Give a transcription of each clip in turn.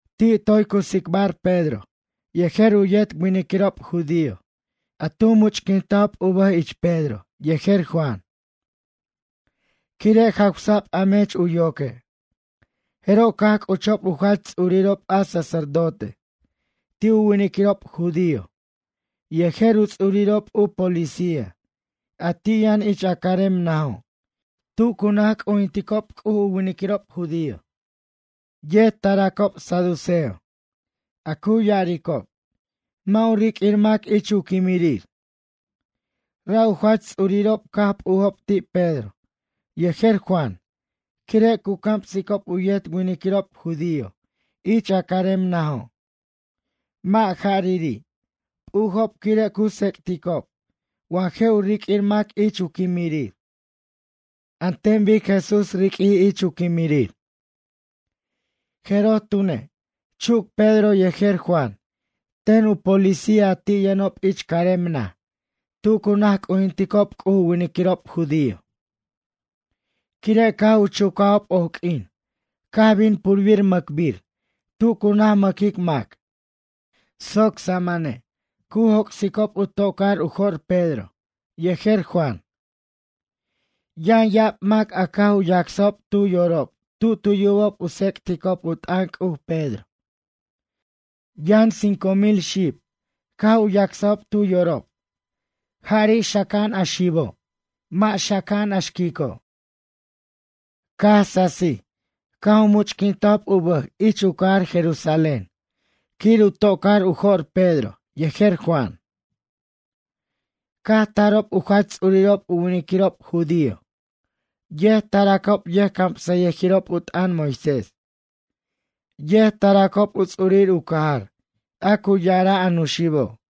Ti' toy cu tsicbar Pedro yejer u yet winiquirob judío a tu much'quintajob u bʌj ich Pedro yejer Juan, quire' jawsa'b a mech u yoque'. Jeroj caj c'uchob u jach ts'urirob a sacerdote ti' u winiquirob judío yejer u ts'urirob u policía a ti' yʌn ich a carem najo' tu cu naj c'ujinticob u winiquirob judío. Yet taracob saduceo, a cu ya'aricob: “Mʌ' u riq'uir mac ich u quimirir.” Ra' u jach ts'uririrob caj p'ujob ti' Pedro yejer Juan quire' cu camsicob u yet winiquirob judío ich a carem najo'. Mʌ' ja'riri', p'ujob quire' cu tsec'ticob wa je' u riq'uir mac ich u quimirir an ten bic Jesús riq'uij ich u quimirir. Jeroj tune', chuc Pedro yejer Juan ten u policía a ti' yʌnob ich carem naj tu cu naj c'ujinticob C'uj u winiquirob judío. Quire' caj u chucajob oq'uin caj bin purbir mʌcbir tu cu naj mʌquic mac soc samane' cu joc'sicob u tocar u jo'r Pedro yejer Juan. Yʌn ya'ab mac a caj u yacsajob tu yorob tu tu yubob u tsec'tic u t'ʌn C'uj Pedro. Yʌn cinco mil xib caj u yacsajob tu yorob, ja'ri' xaca'an a xibo', mʌ' xaca'an a xquico'. Caj sasij caj u much'quintajob u bʌj ich u cajar Jerusalén quir u tocar u jo'r Pedro yejer Juan. Caj tarob u jach ts'urirob u winiquirob judío, yet taracob yʌjcamsʌyʌjirob u t'ʌn Moisés, yet taracob u ts'urir u cajar a cu ya'ara' a nuxibo'.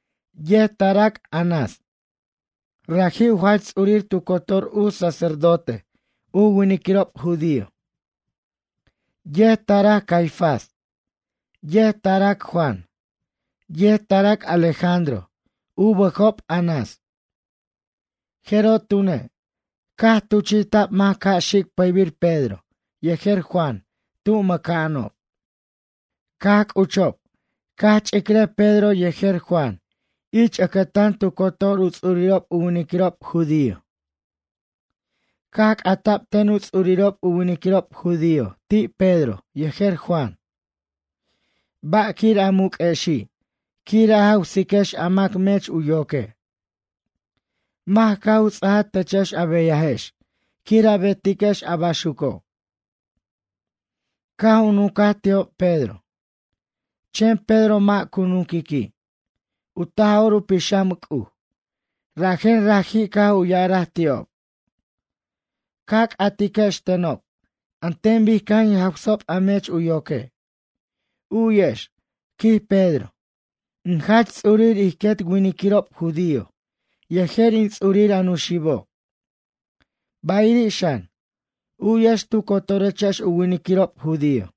Yet tarac Anás, raji' u jach ts'urir tu cotor u sacerdote u winiquirob judío. Yet tarac Caifás, yet tarac Juan, yet tarac Alejandro u bʌjob Anás. Jeroj tune', caj tuchi'ta'b mac ca' xic pʌybir Pedro yejer Juan tu mʌca'anob. Caj c'uchob caj ch'icrʌj Pedro yejer Juan ich ʌcʌtan tu cotor u ts'urirob u winiquirob judío. Caj c'ata'b ten u ts'urirob u winiquirob judío ti' Pedro yejer Juan: ―Ba'quir a muq'uexi' quir a jawsiquex a mac mech u yoque'? Mac caj u ts'aja techex a beyajex quir a betiquex a baxuco'? Caj u nuncaj ti'ob Pedro, chen Pedro mʌ' cu nunquiqui', u Taj'or u Pixam C'uj, rajen raji' caj u ya'araj ti'ob: ―Ca c'atiquex tenob an ten bic caj in jawsajob a mech u yoque'. U'yex ―quij Pedro―, in jach ts'urir ij quet winiquirob judío yejer in ts'urir a nuxibo'. Bayiri' xan, u'yex tu cotorechex u winiquirob judío.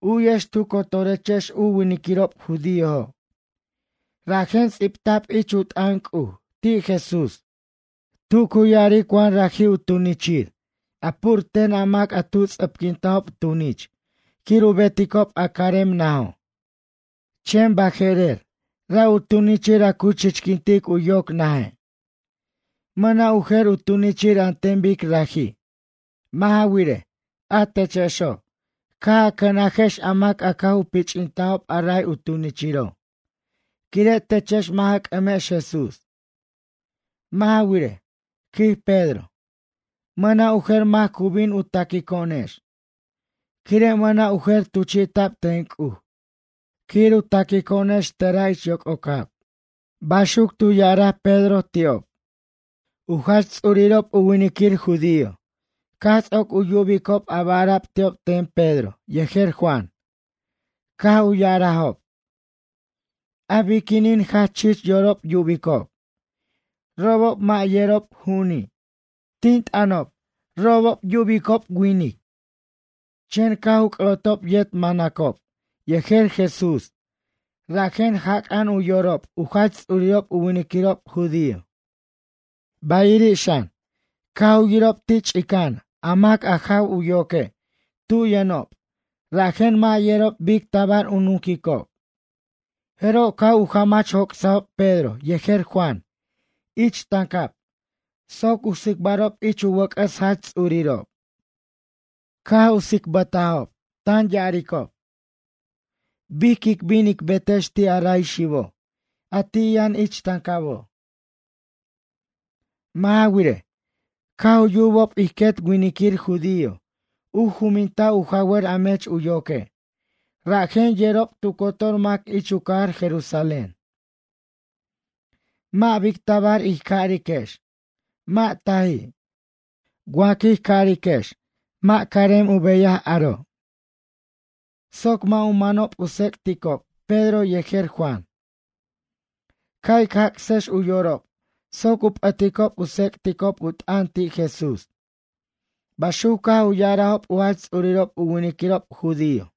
U'yex tu cotorechex u winiquirob judíojo', rajen ts'ibta'b ich u t'ʌn C'uj ti' Jesús tu cu ya'aric wa raji' u tunichir a pur ten a mac a tu ts'ʌpquintajob tunich quir u beticob a carem najo'. Chen baje'rer ra' u tunichir a cu chichquintic u yoc naje'. Mʌna' u jer u tunichir an ten bic raji'. Mʌ' ja wirej, a techexo', caj a cʌnajex a mac a caj u pich'tajob a ray u tunichiro', quire' techex mʌ' ja c'ʌmex Jesús. Mʌ' ja wirej ―quij Pedro―, mʌna' u jer mac cu bin u taquico'onex, quire' mʌna' u jer tuchi'ta'b ten C'uj quir u taquico'onex tera' ich yoc'ocab ―baxuc tu ya'araj Pedro ti'ob. U jach ts'urirob u winiquir judio caj ts'oc u yubicob a ba' ara'b ti'ob ten Pedro yejer Juan caj u ya'arajob: ―A biquinin jach chich yorob yubicob, robob mʌ' yerob ju'uni', tin t'ʌnob robob yubicob gente? Chen caj u c'ʌ'otob yet manacob yejer Jesús rajen jac'a'an u yorob u jach ts'urirob u winiquirob judío. Bayiri' xan, caj u yirob ti' ch'ica'an a mac a jaw u yoque' tu yʌnob rajen mʌ' yerob bic tabar u nuquicob. Jeroj caj u jamach joc'sajob Pedro yejer Juan ich tancab soc u tsicbarob ich u wʌc'ʌs jach ts'urirob. Caj u tsicbʌjtajob tan ya'aricob: ―Bic quic bin ic betex ti' a ray xibo' a ti' yʌn ich tancabo'? Mʌ' ja wirej, caj u yubob ij quet winiquir judío u juminta' u jawʌr a mech u yoque' rajen yerob tu cotor mac ich u cajar Jerusalén. Mʌ' bic tabar ij cariquex: “Mʌ' taji'” wa quij cariquex mʌ' carem u beyaj aro'. Soc mʌ' u manob u tsec'ticob Pedro yejer Juan, ca' ic jac'sex u yorob soc u p'ʌticob u tsec'ticob u t'ʌn ti' Jesús ―baxuc caj u ya'arajob u jach ts'urirob u winiquirob judío.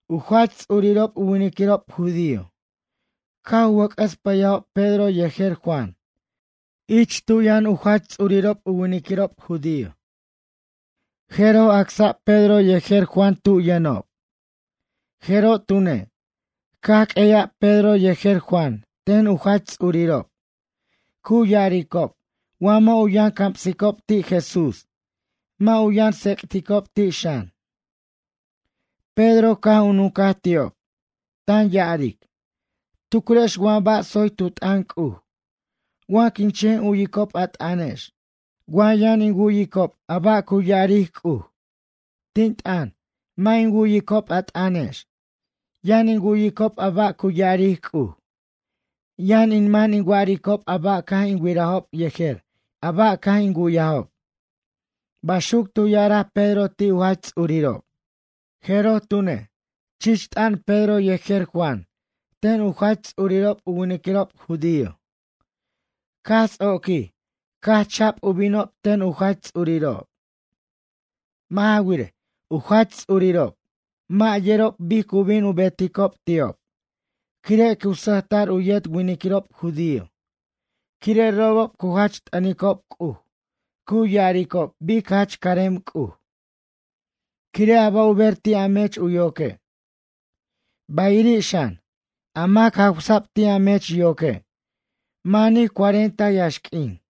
U jach ts'urirob u winiquirob judío caj u wʌc'ʌs pʌyajob Pedro yejer Juan ich tu yʌn a jach ts'urirob u winiquirob judío. Jeroj acsa'b Pedro yejer Juan tu yʌnob. Jeroj tune', caj q'ueya'b Pedro yejer Juan ten u jach ts'urirob cu ya'aricob wa mʌ' u yʌn camsicob ti' Jesús mʌ' u yʌn tsec'ticob ti' xan. Pedro caj u nuncaj ti'ob, tan ya'aric: ―Tucrex wa ba' tsoy tu t'ʌn C'uj, wa quin chen u'yicob a t'ʌnex, wa yʌn in wu'yicob a ba' cu ya'aric C'uj? Tin t'ʌn, mʌ' in wu'yicob a t'ʌnex, yʌn in wu'yicob a ba' cu ya'aric C'uj. Yʌn in man in wa'aricob a ba' caj in wirajob yejer a ba' caj in wu'yajob ―baxuc tu ya'araj Pedro ti' u jach ts'urirob. Jeroj tune', chich t'ʌn Pedro yejer Juan ten u jach ts'urirob u winiquirob judío, caj ts'oquij caj cha'b u binob ten u jach ts'urirob. Mʌ' ja wirej, u jach ts'urirob mʌ' yerob bic cu bin u beticob ti'ob quire' cu sʌjta'r u yet winiquirob judío quire' robob cu jach t'ʌnicob C'uj cu ya'aricob bic jach carem C'uj, quire' a ba' u ber ti' a mech u yoque'. Bayiri' xan, a mac jawsa'b ti' a mech yoque' manij cuarenta yaxq'uin.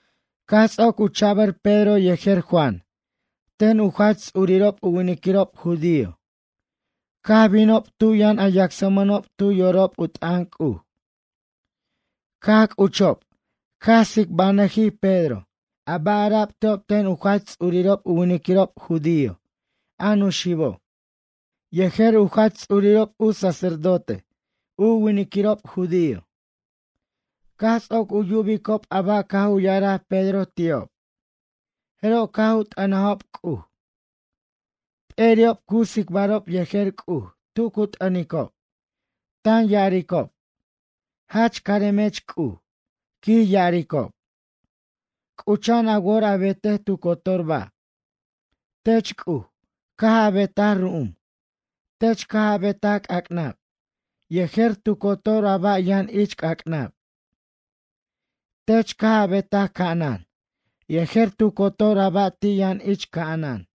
Caj ts'oc u cha'bʌr Pedro yejer Juan ten u jach ts'urirob u winiquirob judío, caj binob tu yʌn a yacsmʌnob tu yorob u t'ʌn C'uj. Caj c'uchob caj tsicbanʌjij Pedro a ba' ara'b ti'ob ten u jach ts'urirob u winiquirob judío a nuxibo', yejer u jach ts'urirob u sacerdote u winiquirob judío. Caj ts'oc u yubicob a ba' caj u ya'araj Pedro ti'ob jeroj caj u t'ʌnajob C'uj. P'eri'ob cu tsicbarob yejer C'uj tu cu t'ʌnicob, tan ya'aricob: ―Jach caremech C'uj ―quij ya'aricob―, c'ucha'an a wor a betej tu cotor ba'. Tech C'uj caj a betaj ru'um, tech caj a betaj c'ac'nab yejer tu cotor a ba' yʌn ich c'ac'nab. Tech caj a betaj ca'anan yejer tu cotor a ba' ti' yʌn ich ca'anan.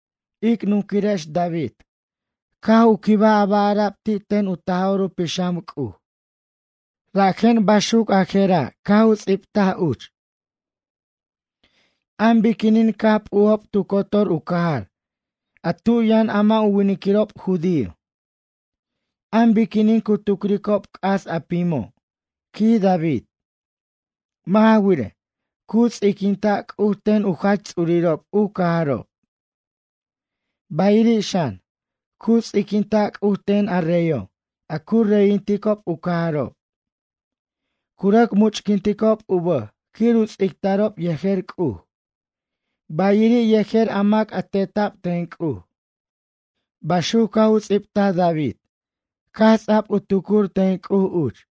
Ic nunquirex David caj u quibaj a ba' ara'b ti' ten u Taj'or u Pixam C'uj rajen baxuc a jera' caj u ts'ibtaj uch: An biquinin caj p'ujob tu cotor u cajar a tu yʌn a mʌ' u winiquirob judío? An biquinin cu tucricob c'as a pimo'? quij David. Mʌ' ja wirej, cu ts'iquinta' C'uj ten u jach ts'urirob u cajarob. Bayiri' xan, cu ts'iquinta' C'uj ten a reyo' a cu reyinticob u cajarob. Cu rʌc much'quinticob u bʌj quir u ts'ictarob yejer C'uj, bayiri' yejer a mac a teta'b ten C'uj. Baxuc caj u ts'ibtaj David caj ts'a'b u tucur ten C'uj uch.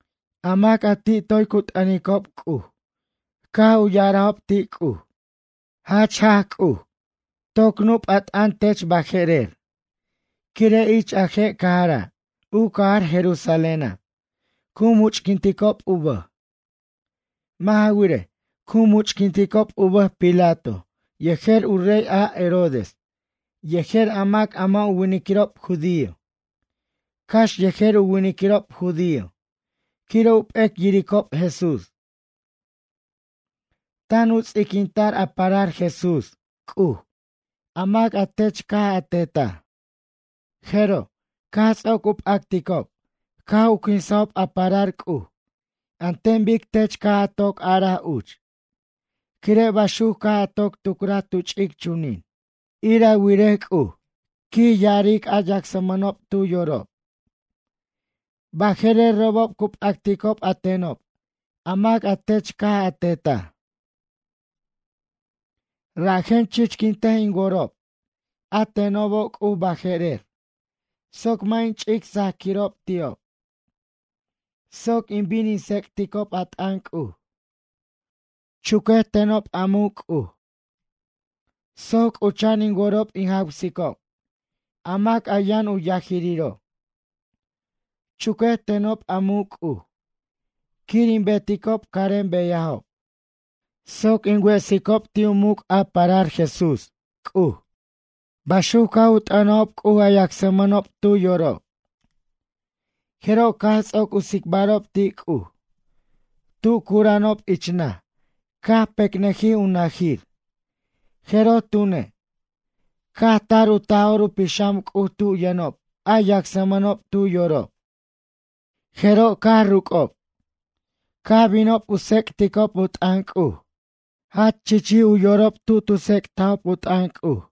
A mac a ti' toy cu t'ʌnicob C'uj caj u ya'arajob ti' C'uj: ―Jach jaj C'uj, toc nup' a t'ʌn tech baje'rer, quire' ich a je' cajara', u cajar Jerusaléna', cu much'quintob u bʌj. Mʌ' ja wirej, cu much'quintob u bʌj Pilato yejer u rey a Herodes yejer a mac a mʌ' u winiquirob judío, cax yejer u winiquirob judío quire' u p'ec yiricob Jesús. Tan u ts'iquinta'r a parar Jesús, C'uj, a mac a tech caj a tetaj. Jeroj, caj ts'oc u p'acticob caj u quinsajob a parar C'uj an ten bic tech caj a toc araj uch, quire' baxuc caj a toc tucraj tu ch'ic chunin. Ir a wirej C'uj, ―quij ya'aric a yacsmʌnob tu yorob―, baje'rer robob cu p'acticob a tenob a mac a tech caj a tetaj. Rajen chichquintej in worob a tenobo' C'uj baje'rer, soc mʌ' in ch'ic sajaquirob ti'ob, soc in bin in tsec'ticob a t'ʌn C'uj. Chuquej tenob a muc' C'uj, soc c'ucha'an in worob in jawsicob a mac a yʌn u yajiriro'. Chuquej tenob a muc' C'uj, quir in beticob carem beyajob, soc in wesicob ti'ob u muc' a parar Jesús, C'uj. ―baxuc caj u t'ʌnajob C'uj a yacsmʌnob tu yorob. Jeroj caj ts'oc u tsicbarob ti' C'uj, tu cura'anob ich naj caj pecnʌjij u nʌjir, jeroj tune', caj tar u Taj'or u Pixam C'uj tu yʌnob a yacsmʌnob tu yorob, jeroj caj ruc'ob, caj binob u tsec'ticob u t'ʌn C'uj. Jach chichij u yorob tu tu tsec'tajob u t'ʌn C'uj.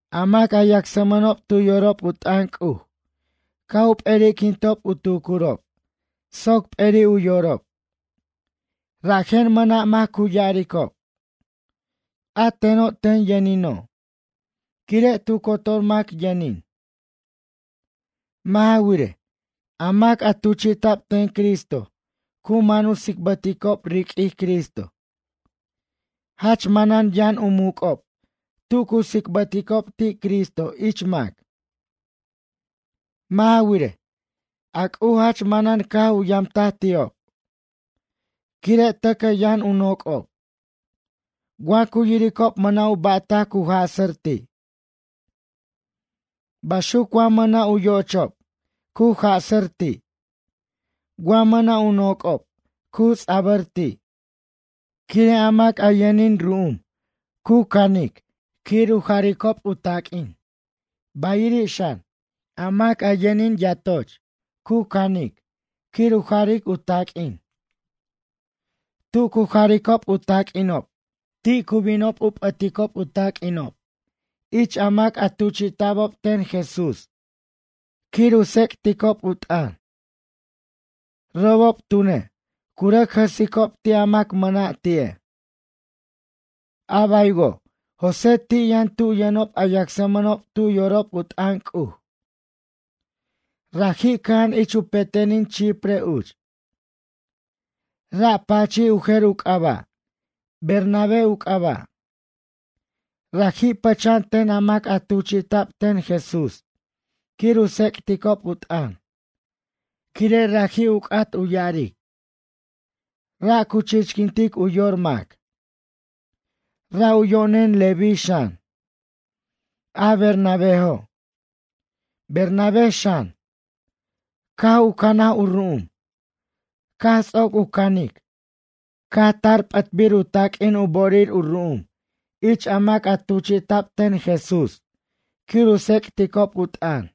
A mac a yacsmʌnob tu yorob u t'ʌn C'uj caj u p'eriquintob u tucurob soc p'eri' u yorob. Rajen mʌna' mac cu yaricob: “A teno' ten yʌnino'.” Quire' tu cotor mac yʌnin. Mʌ' ja wirej, a mac a tuchi'ta'b ten Cristo cu man u tsicbʌticob riq'uij Cristo. Jach manan yʌn u muc'ob tu cu tsicbʌticob ti' Cristo ich mac. Mʌ' ja wirej, a C'uj jach manan caj u yamtaj ti'ob. Quire' tʌcʌ yʌn u noc'ob. Wa cu yiricob mʌna' u ba'tac cu jasʌr ti'. Baxuc wa mʌna' u yo'ochob cu jasʌr ti'. Wa mʌna' u noc'ob cu ts'abʌr ti'. Quire' a mac a yʌnin ru'um cu cʌnic quir u jaricob u taq'uin, bayiri' xan, a mac a yʌnin yatocho' cu canic quir u jaric u taq'uin. Tu cu jaricob u taq'uinob ti' cu binob u p'ʌticob u taq'uinob ich a mac a tuchta'bob ten Jesús quir u tsec'ticob u t'ʌn. Robob tune', cu rʌc jʌsicob ti' a mac mʌna' ti'e'. A baywo', José ti' yʌn tu yʌnob a yacsmʌnob tu yorob u t'ʌn C'uj. Raji' cʌja'an ich u petenin Chipre uch. Ra' pachij u jer u c'aba', Bernabé u c'aba'. Raji' pʌcha'an ten a mac a tuchi'ta'b ten Jesús quir u tsec'ticob u t'ʌn, quire' raji' u c'at u ya'aric: Ra' cu chichquintic u yor mac. Ra' u yo'nen Leví xan, a Bernabéjo'. Bernabé xan, caj u canaj u ru'um caj ts'oc u canic caj tar p'ʌtbir u taq'uin u bo'orir u ru'um ich a mac a tuchi'ta'b ten Jesús quir u tsec'ticob u t'ʌn.